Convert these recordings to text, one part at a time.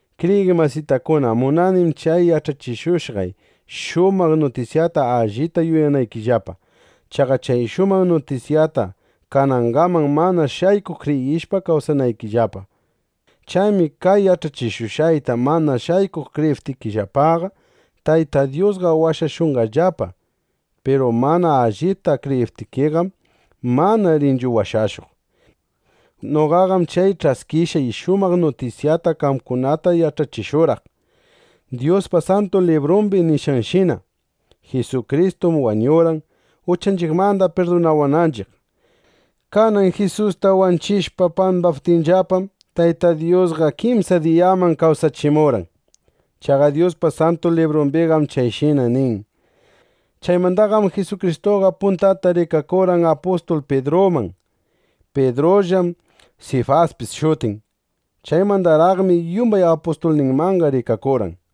Kriyiq masitakuna, munanim chay yach'achishushqay shumaq nutisyata allita yuyanaykillapa. Chaqa chay shumaq nutisyata kanangaman mana shaykuq kriyishpa kawsaykangillapa. Chaymi kay yach'achishushqayta mana shaykuq kriyiptikillapaqa, Tayta Dyusqa washashushqallapa. Piru mana allipta kriyiptikiqam, mana rinchu washashuq. Noqaqam chay ch'askishqay shumaq nutisyata qamkunata yach'achishurqaq, Dyuspa Santu Librumbi nishqanshina: Jisukristum wañurqan, uchanchiqmanda pirdunawananchiq. Kanan Jisusta wanchishpa pambaptinllapam, Tayta Dyusqa kimsa diyaman kawsachimurqan. Chaqa Dyuspa Santu Librumbiqam chayshina nin. Chaymandaqam Jisukristuqa puntata rikakurqan apustul Pidruman. (Pidrullam Sifaspis shutin.) Chaymandaraqmi yumbay apustulninmanqa rikakurqan.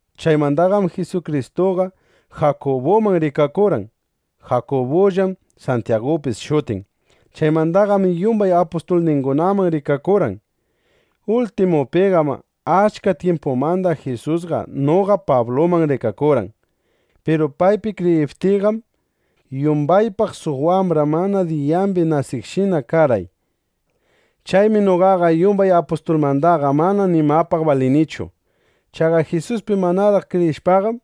Chaymandaqam Jisukristuqa Jakubuman rikakurqan. (Jakubullam Santyagupis shutin.) Chaymandaqam yumbay apustulningunaman rikakurqan. Ultimupiqam achka tyimpumanda Jisusqa noqa Pabluman rikakurqan. Piru paypi kriyiptiyqam, yumbaypaq suq wambra mana diyambi nasishqashina karqay. Chaymi noqaqa yumbay apustulmandaqa mana nimapaq balinichu. Chaqa Jisuspi manaraq kriyishpaqam,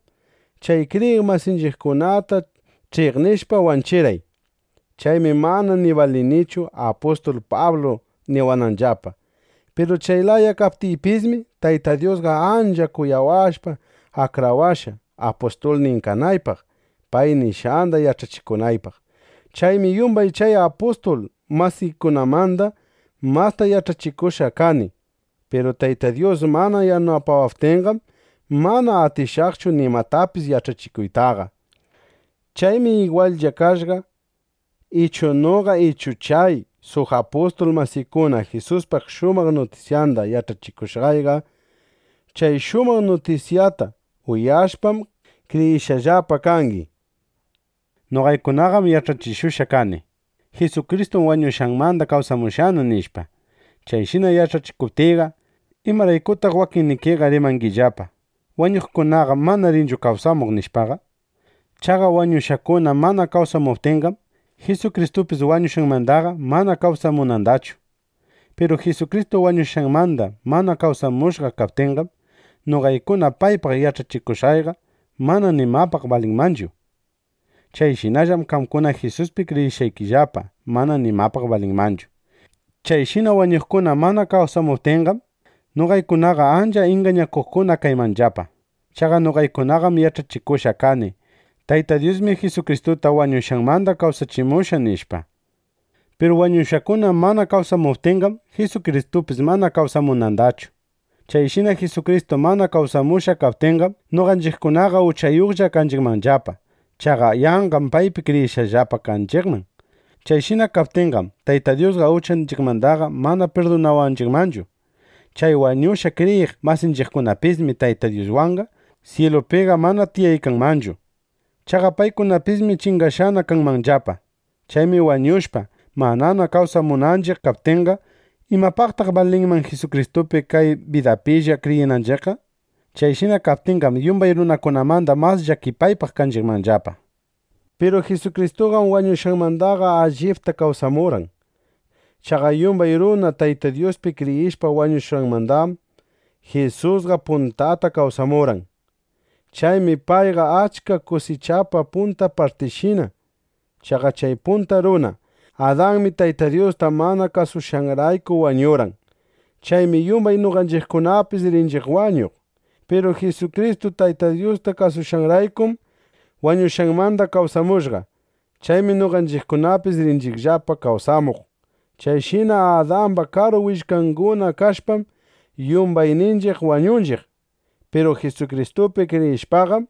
chay kriyiq masinchiqkunata ch'iqnishpa wanchirqay. Chaymi mana ni balinichu “Apustul Pablu” niwananllapa. Piru chay laya kaptiypismi, Tayta Dyusqa ancha kuyawashpa akrawashqa, apustulnin kanaypaq, pay nishqanda yach'achikunaypaq. Chaymi yumbay chay apustul masiykunamanda masta yach'achikushqa kani. Piru Tayta Dyus mana yanapawaptinqam, mana atinaytachu nimatapis yach'achikuytaqa. Chaymi igwallla kashqa ichu noqa ichu chay suq apustul masiykuna Jisuspa shumaq nutisyanda yach'achikushqayqa. Chay shumaq nutisyata uyashpam, kriyishqallapa kangi. Noqaykunaqam yach'achishushqa kani: “Jisukristum wañushqanmanda kawsamushqana”, nishpa. Chayshina yach'achishuptiyqa, ¿imaraykutaq wakinnikiqa rimangillapa: “Wañuqkunaqam mana rinchu kawsamuq”, nishpaqa? Chaqa wañushqakuna mana kawsamuptinqam, Jisukristupis wañushqanmandaqa mana kawsamunandachu. Piru Jisukristu wañushqanmanda mana kawsamushqa kaptinqam, noqaykuna paypaq yach'achikushqayqa mana nimapaq balinmanchu. Chayshinallam qamkuna Jisuspi kriyishqaykillapa mana nimapaq balinmanchu. Chayshina wañuqkuna mana kawsamuptinqam, noqaykunaqa ancha ingañakuqkuna kaymanllapa. Chaqa noqaykunaqam yach'achikushqa kani: “Tayta Dyusmi Jisukristuta wañushqanmanda kawsachimushqa”, nishpa. Piru wañushqakuna mana kawsamuptinqam, Jisukristupis mana kawsamunandachu. Chayshina Jisukristu mana kawsamushqa kaptinqam, noqanchiqkunaqa uchayuqlla kanchiqmanllapa. Chaqa yanqam paypi kriyishqallapa kanchiqman. Chayshina kaptinqam, Tayta Dyusqa uchanchiqmandaqa mana pirdunawanchiqmanchu. Chay wañushqa kriyiq masinchiqkunapismi Tayta Dyuswanqa syilupiqa mana tiyaykanmanchu. Chaqa paykunapismi chingashqana kanmanllapa. Chaymi wañushpa, manana kawsamunanchiq kaptinqa, ¿imapaqtaq balinman Jisukristupi kay bidapilla kriyinanchiqqa? Chayshina kaptinqam, yumbay runakunamanda mas llakipaypaq kanchiqmanllapa. Piru Jisukristuqam wañushqanmandaqa allipta kawsamurqan. Chaqa yumbay runa Tayta Dyuspi kriyishpa wañuqkunamandam, Jisusqa puntata kawsamurqan. Chaymi payqa achka kusichapa punta partinshina. Chaqa chay punta runa Adanmi Tayta Dyusta mana kasushqanrayku wañurqan. Chaymi yumbay noqanchiqkunapis rinchiq wañuq. Piru Jisukristu Tayta Dyusta kasushqanraykum, wañushqanmanda kawsamushqa. Chaymi noqanchiqkunapis rinchiqllapa kawsamuq. Chayshina Adamba karu willkanguna kashpam, yumbayninchiq wañunchiq. Piru Jisukristupi kriyishpaqam,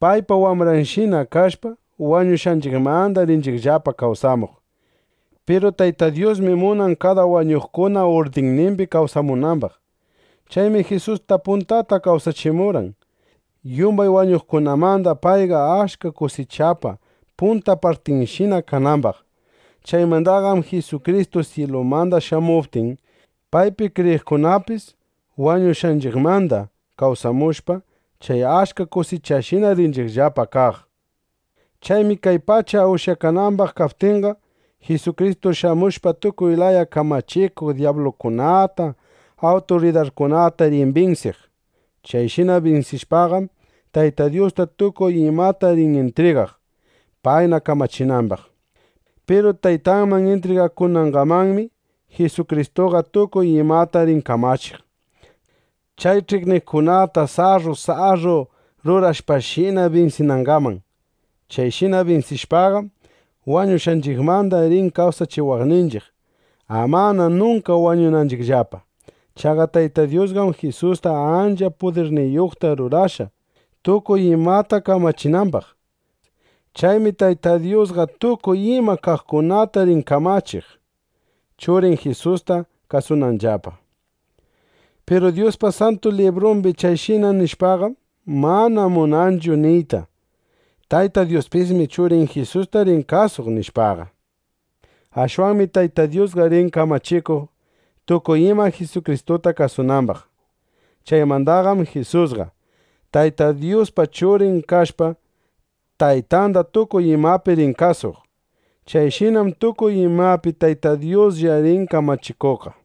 paypa wambranshina kashpa, wañushqanchiqmanda rinchiqllapa kawsamuq. Piru Tayta Dyusmi munan kada wañuqkuna urdinnimbi kawsamunambaq. Chaymi Jisusta puntata kawsachimurqan, yumbay wañuqkunamanda payqa achka kusichapa punta partinshina kanambaq. Chaymandaqam Jisukristu syilumanda shamuptin, paypi kriyiqkunapis wañushqanchiqmanda kawsamushpa, chay achka kusichashina rinchiqllapa kaq. Chaymi kay pacha ushyakanambaq kaptinqa, Jisukristu shamushpa, tukuy laya kamachikuq dyablukunata, awturidarkunata rin binsiq. Chayshina binsishpaqam, Tayta Dyusta tukuy imata rin intrigaq, payna kamachinambaq. Piru Taytanman intrigakunangamanmi, Jisukristuqa tukuy imata rin kamachiq, chay ch'iqniqkunata sarru sarru rurashpashina binsinangaman. Chayshina binsishpaqam, wañushqanchiqmanda rin kawsachiwaqninchiq, amana nunka wañunanchiqllapa. Chaqa Tayta Dyusqam Jisusta ancha pudirniyuqta rurashqa, tukuy imata kamachinambaq. Chaymi Tayta Dyusqa tukuy ima kaqkunata rin kamachiq, Churin Jisusta kasunanllapa. Piru Dyuspa Santu Librumbi chayshina nishqanqam mana munanchu niyta: “Tayta Dyuspismi Churin Jisusta rin kasuq”, nishpaqa. Ashwanmi Tayta Dyusqa rin kamachikuq, tukuy ima Jisukristuta kasunambaq. Chaymandaqam Jisusqa, Tayta Dyuspa Churin kashpa, Taytanda tukuy imapi rin kasuq. Chayshinam tukuy imapi Tayta Dyuslla rin kamachikuqqa.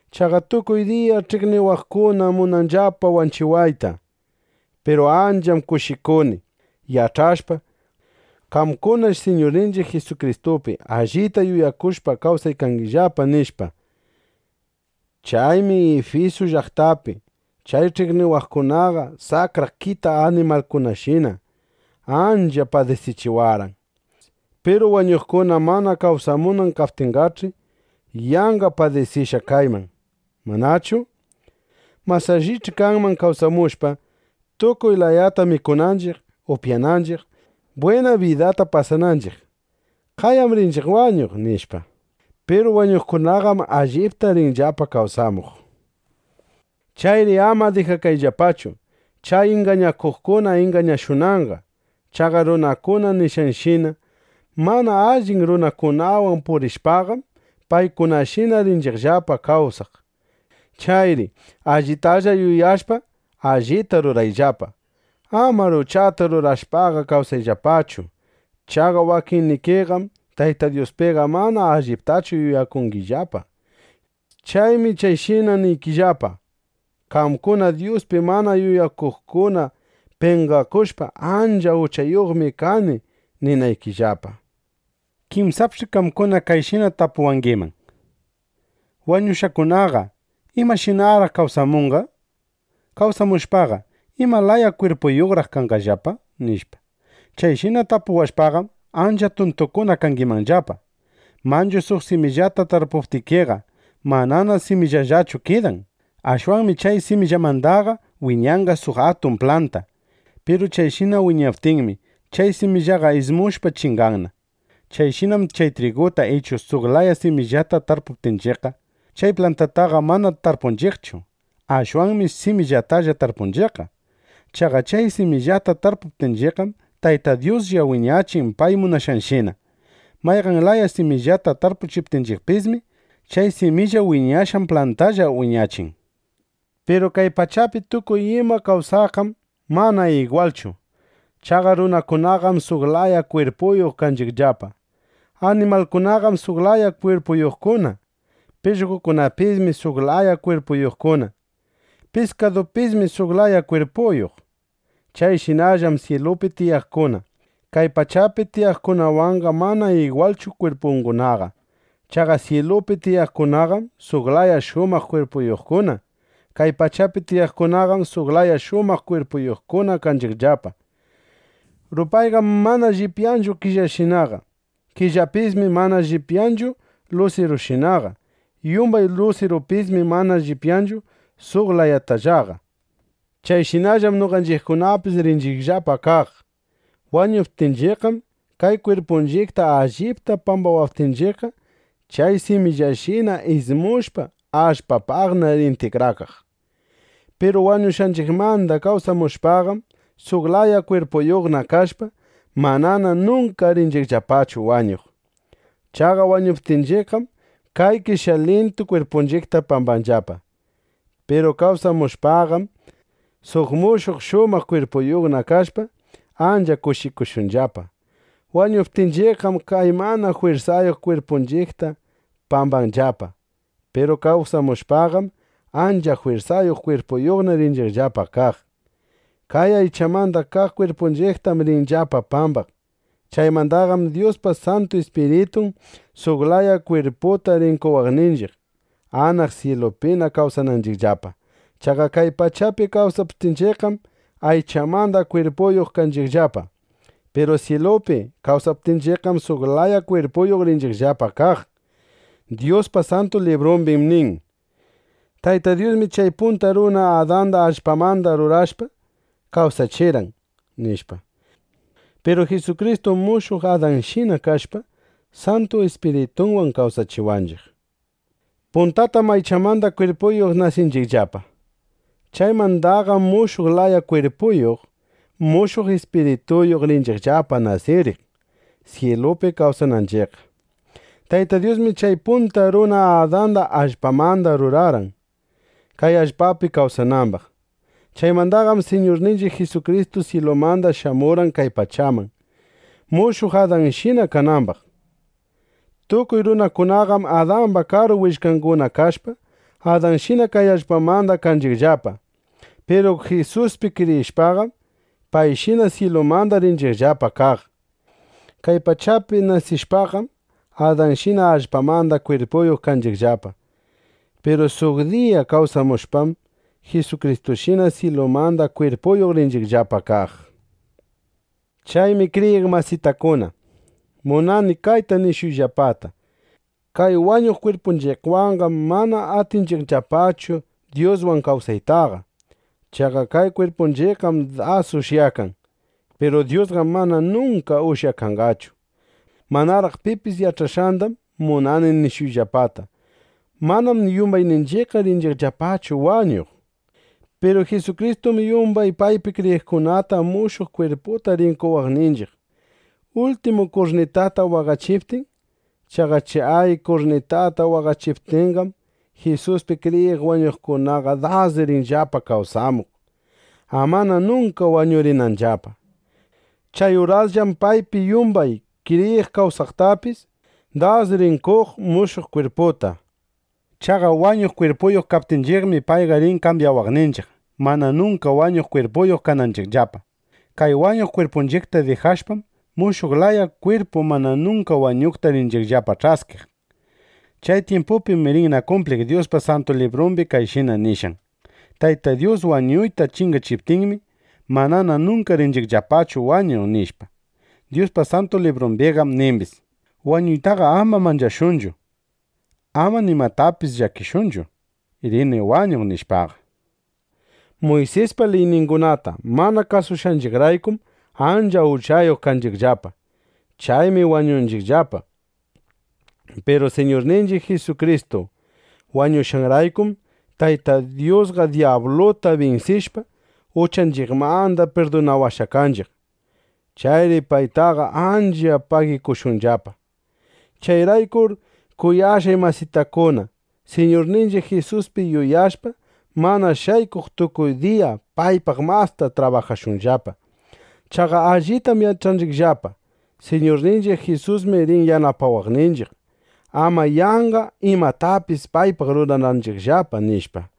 Chaqa tukuy diya ch'iqniwaqkunam munanllapa wanchiwayta. Piru ancham kushikuni, yach'ashpa: Qamkunash Siñurninchiq Jisukristupi allita yuyakushpa kawsaykangillapa, nishpa. Chaymi Ifisu llaqtapi chay ch'iqniwaqkunaqa saqra kita animalkunashina ancha padisichiwarqan. Piru wañuqkuna mana kawsamunan kaptinqach'i, yanqa padisishqa kayman, ¿manachu? Mas allich'i kanman kawsashpa, tukuy layata mikunanchiq, upyananchiq, bwina bidata pasananchiq: “Qayam rinchiq wañuq”, nishpa. (Piru wañuqkunaqam allipta rinllapa kawsamuq.) Chayri ama dijakayllapachu, chay ingañakuqkuna ingañashunanqa. Chaqa runakuna nishqanshina: Mana allin runakunawan purishpaqam, paykunashina rinchiqllapa kawsaq. Chayri ¡allitana yuyashpa, allita rurayllapa! ¡Amar uchata rurashpaqa kawsayllapachu! Chaqa wakinnikiqam Tayta Dyuspiqa mana alliptachu yuyakungillapa. Chaymi chayshinaqa niykillapa, qamkuna Dyuspi mana yuyakuqkuna penqakushpa, “ancha uchayuqmi kani”, ninaykillapa. Kinsapch'i qamkuna kayshina tapuwangiman: “Wañushqakunaqa, ¿imashinaraq kawsamunqa? Kawsamushpaqa, ¿ima laya kwirpuyuqraq kanqallapa?” nishpa. Chayshina tapuwashpaqam, ancha tuntukuna kangimanllapa. Manchu suq simillata tarpuptikiqa, manana simillallachu kidan. Ashwanmi chay simillamandaqa wiñanna suq atun planta. Piru chayshina wiñaptinmi, chay simillaqa ismushpa chinganna. Chayshinam chay triguta ichu suq laya simillata tarpuptinchiqqa, chay plantataqa mana tarpunchiqchu; ashwanmi simillatalla tarpunchiqqa. Chaqa chay simillata tarpuptinchiqqam, Tayta Dyuslla wiñachin pay munashqanshina. Mayqan laya simillata tarpuptinchiqpismi, chay similla wiñashqan plantandalla wiñachin. Piru kay pachapi tukuy ima kawsaqqam mana igwalchu. Chaqa runakunaqam suq laya kwirpuyuq kanchiqllapa; animalkunaqam suq laya kwirpuyuqkuna, pishqokunapismi suq laya kwirpuyuqkuna, piskadupismi suq laya kwirpuyuq. Chayshinallam syilupi tiyaqkuna kay pachapi tiyaqkunawanqa mana igwalchu kwirpungunaqa. Chaqa syilupi tiyaqkunaqam suq laya shumaq kwirpuyuqkuna. Kay pachapi tiyaqkunaqam suq laya shumaq kwirpuyuqkuna kanchiqllapa. Rupayqam mana llipyanchu killashinaqa. Killapismi mana llipyanchu lusirushinaqa. Yumbay lusirupismi mana llipyanchu suq layatallaqa. Chayshinallam noqanchiqkunapis rinchiqllapa kaq. Wañuptinchiqqam kay kwirpunchiqta allpapi pambawaptinchiqqa, chay simillashina ismushpa, allpapaqna rin tikrakaq. Piru wañushqanchiqmanda kawsamushpaqam, suq laya kwirpuyuqna kashpa, manana nunka rinchiqllapachu wañuq. Chaqa wañuptinchiqqam, kay qeshyaylintu kwirpunchiqta pambanllapa. Piru kawsamushpaqam, suq mushuq shumaq kwirpuyuqna kashpa, ancha kushikushunllapa. Wañuptinchiqqam kay mana jwirsayuq kwirpunchiqta pambanllapa. Piru kawsamushpaqam, ancha jwirsayuq kwirpuyuqna rinchiqllapa kaq. Kay aychamanda kaq kwirpunchiqtam rinllapa pambaq. Chaymandaqam Dyuspa Santu Ispiritun suq laya kwirputa rin qowaqninchiq, anaq syilupina kawsananchiqllapa. Chaqa kay pachapi kawsananchiqqam aychamanda kwirpuyuq kanchiqllapa. Piru syilupi kawsananchiqqam suq laya kwirpuyuq rinchiqllapa kaq. Dyuspa Santu Librumbim nin: “Tayta Dyusmi chay punta runa Adanda allpamanda rurashpa, kawsachirqan”, nishpa. Piru Jisukristum mushuq Adanshina kashpa, Santu Ispiritunwan kawsachiwanchiq. Puntatam aychamanda kwirpuyuq nasinchiqllapa. Chaymandaqam mushuq laya kwirpuyuq, mushuq ispirituyuq rinchiqllapa nasiriq, syilupi kawsananchiqqa. Tayta Dyusmi chay punta runa Adanda allpamanda rurarqan, kay allpapi kawsanambaq. Chaymandaqam Siñurninchiq Jisukristu syilumanda shamurqan kay pachaman, mushuq Adanshina kanambaq. Tukuy runakunaqam Adamba karu willkanguna kashpa, Adanshina kay allpamanda kanchiqllapa. Piru Jisuspi kriyishpaqam, payshina syilumanda rinchiqllapa kaq. Kay pachapi nasishpaqam, Adanshina allpamanda kwirpuyuq kanchiqllapa. Piru suq diya kawsamushpam, Jisukristushina syilumanda kwirpuyuq rinchiqllapa kaq. Chaymi kriyiq masitakuna, munani kayta nishuyllapata: Kay wañuq kwirpunchiqwanqam mana atinchiqllapachu Dyuswan kawsaytaqa. Chaqa kay kwirpunchiqqam das ushyakan. Piru Dyusqam mana nunka ushyakanqachu. Manaraq pipis yach'ashqandam munani nishuyllapata: Manam yumbayninchiqqa rinchiqllapachu wañuq. Piru Jisukristum yumbay paypi kriyiqkunata mushuq kwirputa rin qowaqninchiq, ultimu kurnitata waqachiptin. Chaqa chay kurnitata waqachiptinqam, Jisuspi kriyiq wañuqkunaqa das rinllapa kawsamuq, amana nunka wañurinanllapa. Chay urasllam paypi yumbay kriyiq kawsaqtapis das rin qoq mushuq kwirputa. Chaqa wañuq kwirpuyuq kaptinchiqmi, payqa rin kambyawaqninchiq, mana nunka wañuq kwirpuyuq kananchiqllapa. Kay wañuq kwirpunchiqta dijashpam, mushuq laya kwirpu mana nunka wañuqta rinchiqllapa ch'askiq. Chay tyimpupim, rinna kumpliq Dyuspa Santu Librumbi kayshina nishqan: “Tayta Dyus wañuyta chingachiptinmi, manana nunka rinchiqllapachu wañuq”, nishpa. Dyuspa Santu Librumbiqam nimbis: “Wañuytaqa ama manchashunchu. Ama nimapaqpis llakishunchu: Rini wañuq”, nishpaqa. Muysispa liyningunata mana kasushqanchiqraykum ancha uchayuq kanchiqllapa. Chaymi wañunchiqllapa. Piru Siñurninchiq Jisukristu wañushqanraykum, Tayta Dyusqa dyabluta binsishpa, uchanchiqmanda pirdunawashqa kanchiq. Chayri paytaqa ancha pagikushunllapa. Chayraykur kuyashqay masitakuna, Siñurninchiq Jisuspi yuyakushpa, mana shaykuq tukuy diya paypaq masta trabajashunllapa. Chaqa allitam yach'anchiqllapa: Siñurninchiq Jisusmi rin yanapawaqninchiq, ama yanqa imatapis paypaq rurananchiqllapa, nishpa.